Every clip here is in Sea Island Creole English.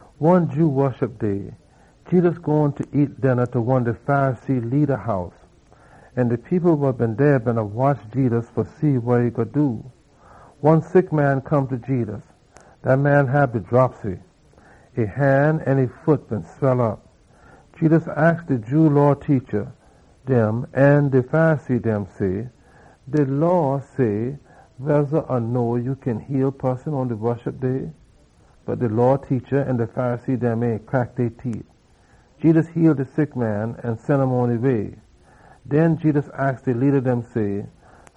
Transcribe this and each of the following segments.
One Jew Woshup Day Jedus gone fa nyam dinna ta one de Pharisee leada dem house. An de people wa been dey beena watch Jedus fa see wa e gwine do. One sick man come ta Jedus wa hab de dropsy. E han an e foot been swell op. Jedus aks de Jew Law teacha dem an de Pharisee dem say, “De Law say weza or no ya kin heal poson pon de Woshup Day?” Bot de Law teacha dem an de Pharisee dem ain crack e teet. Jedus heal de sick man, an sen um pon e way. Den Jedus aks de leada dem say,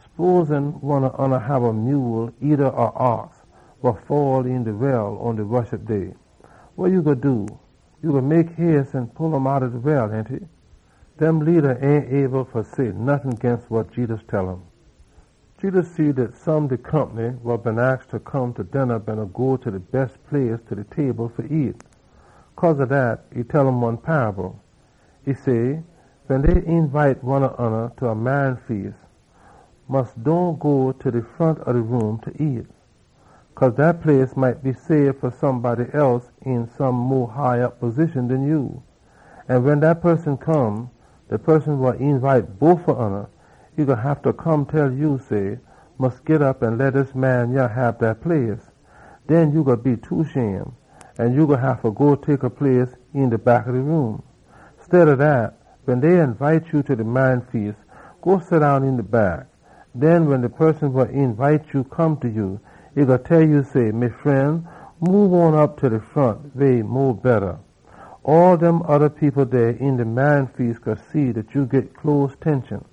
“Sposin one ob oona hab a mule eeda a ox wa fall een de well pon de Woshup Day. Wa ya gwine do? Ya gwine mek hace an pull um outta de well, ainty?” Dem leada ain been able fa say nottin ginst wa Jedus tell um. Jedus see dat some de compny wa been aks fa come ta dinna been go ta de bes place ta de table fa nyam. Cause ob dat, e tell um one paable. E say, “Wen dey eenbite one ob oona ta a marry feas, ya mus dohn go ta de front ob de room fa nyam. Cause ef dat place been sabe fa somebody else een some mo high op position den ya, wen dat poson come, de poson wa been eenbite ya, e gwine haffa come tell ya say, ‘Mus git op, leh dis man yah hab dat place!’ Den ya gwine be too shame, an ya gwine haffa go tek a place een de back ob de room. Steada dat, wen dey eenbite ya ta de marry feas, go seddown een de back. Den wen de poson wa eenbite ya come ta ya, e gwine tell ya say, ‘Me fren, moob on op ta de front weh e mo betta.’ All dem oda people dey een de marry feas gwine see dat ya git hona.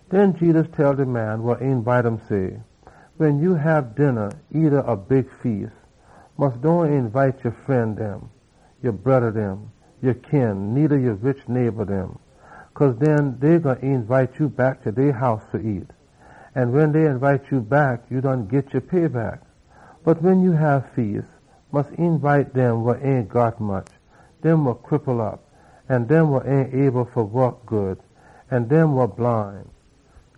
Den Jedus tell de man wa eenbite um say, “Wen ya hab dinna eeda a big feas, mus dohn eenbite ya fren dem, ya broda dem, ya kin, needa ya rich neighba dem. Cause den dey gwine eenbite ya back ta dey house fa nyam, an wen dey eenbite ya back, ya done git ya payback. Bot wen ya hab feas, mus eenbite dem wa ain got much, dem wa cripple op, an dem wa ain able fa waak good, an dem wa bline.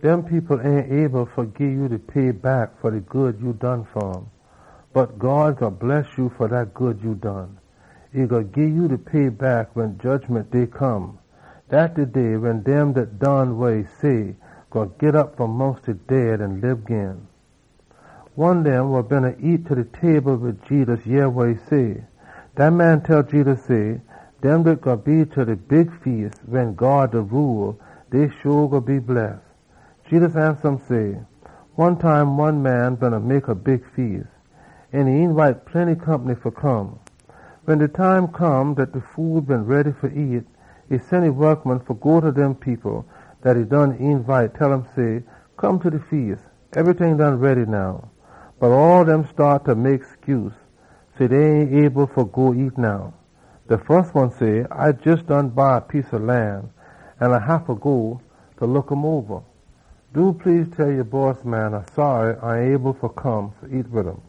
Dem people ain able fa gii ya de payback fa de good ya done fa um. Bot God gwine bless ya fa dat good ya done. E gwine gii ya de payback pon de day wen dem dat done wa God say gwine git op fom mongst de dead an lib gin.” One dem wa beena nyam ta de table wid Jedus yeh wa e say. Dat man tell Jedus say, “Dem dat gwine be ta de big feas wen God da rule, dey sho gwine be bless!” Jedus ansa um say, “One time one man beena mek a big feas, an e eenbite plenty compny fa come. Wen de time come dat de food been ready fa nyam, e sen e wokman fa go ta dem people dat e been eenbite, tell um say, ‘Come ta de feas. Ebryting done ready now!’ Bot all dem staat fa mek scuse, say dey ain able fa go nyam now. De fus one say, ‘A jes buy a piece ob lan, an A haffa go fa look um oba. Do please, tell ya bossman A saary A ain able fa come nyam wid um.’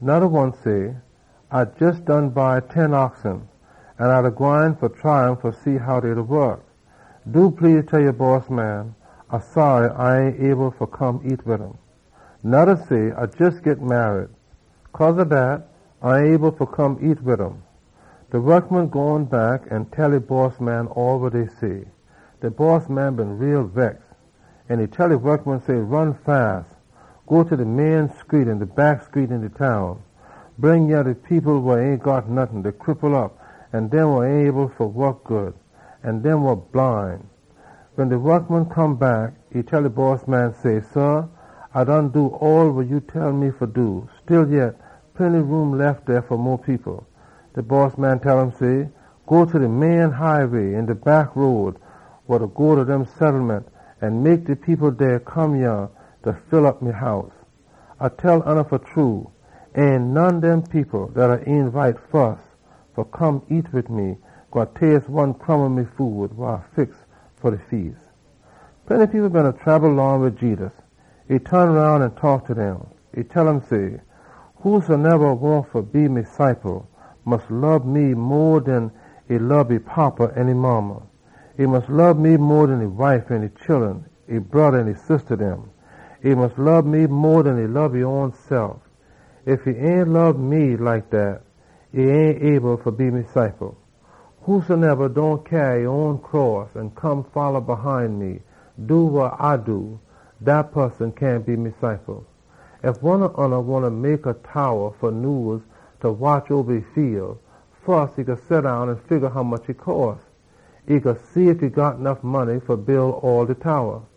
Noda one say, ‘A jes buy ten oxen, an A da gwine fa try um fa see how dey da wok. Do please, tell ya bossman A saary A ain able fa come nyam wid um.’ Noda say, ‘A jes git marry. Cause ob dat, A ain able fa come nyam wid um.’ De wokman gone back an tell e bossman all wa dey say. De bossman been too bex, an e tell e wokman say, ‘Ron quick! Go ta de main screet an de back screet een de town. Bring yah de people wa ain got nottin, de cripple op, an dem wa ain able fa waak good, an dem wa bline.’ Wen de wokman come back, e tell e bossman say, ‘Sah, A done do all wa ya tell me fa do. Stillyet, plenty room lef dey fa mo people.’ De bossman tell um say, ‘Go ta de main highway an de back road wa go ta dem settlement an mek de people dey come yah fa full op me house! A da tell oona fa true, ain none dem people dat A been eenbite fus fa come nyam wid me gwine taste one leetle bit ob de food wa A fix fa de feas!’” Plenty people beena trabel long wid Jedus. E ton roun an taak ta dem. E tell um say, “Whosoneba wahn fa be me ciple mus lob me mo den e lob e fada an e modda. E mus lob me mo den e wife an e chullun, e broda an e sista dem. E mus lob me mo den e lob e own sef. Ef e ain lob me like dat, e ain able fa be me ciple. Whosoneba dohn tote e own cross an come folla hine me, dat poson cyahn be me ciple. “Ef one ob oona wahn fa mek a towa fa nyuse fa watch oba ya fiel, fus ya gwine seddown an figga hommuch e gwine cost. Ya gwine see ef ya got nuff money fa build all de towa.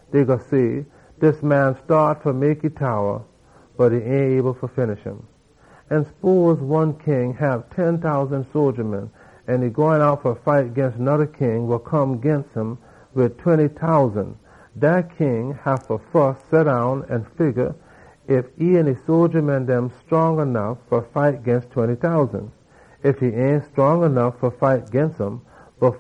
Dey gwine say, ‘Dis man staat fa mek e towa, bot e ain able fa finish um!’ “An sposin one king hab ten tousan sodja an e gwine out fa fight noda king wa come ginst um wid twenty tousan. Dat king haffa fus seddown an figga ef e an e sodja dem scrong nuff fa fight dem twenty tousan. Ef e ain scrong nuff fa fight um,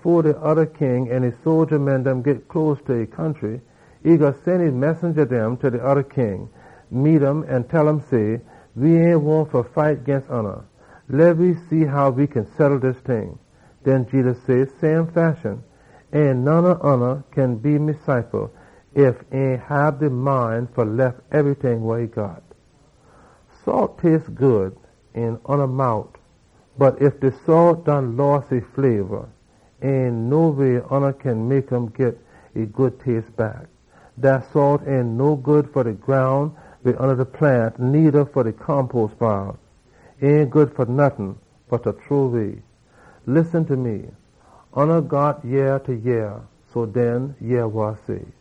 fo de oda king an e sodja dem git close ta e country, e gwine sen e messenja dem ta de oda king, meet um an tell um say, ‘We ain wahn fa fight ginst oona. Leh we see how we kin settle dis ting.’” Den Jedus say, “Same fashion, ain none ob oona kin be me ciple ef e ain hab de mind fa lef ebryting wa e got. “Salt taste good een oona mout, bot ef de salt done loss e taste, ain no way oona kin mek um git e good taste back. Dat salt ain no good fa de groun, needa fa mek fertiliza. E ain good fa nottin bot fa chunk out. Oona got yea fa yeh, ainty? Den oona mus yeh wa A da say!”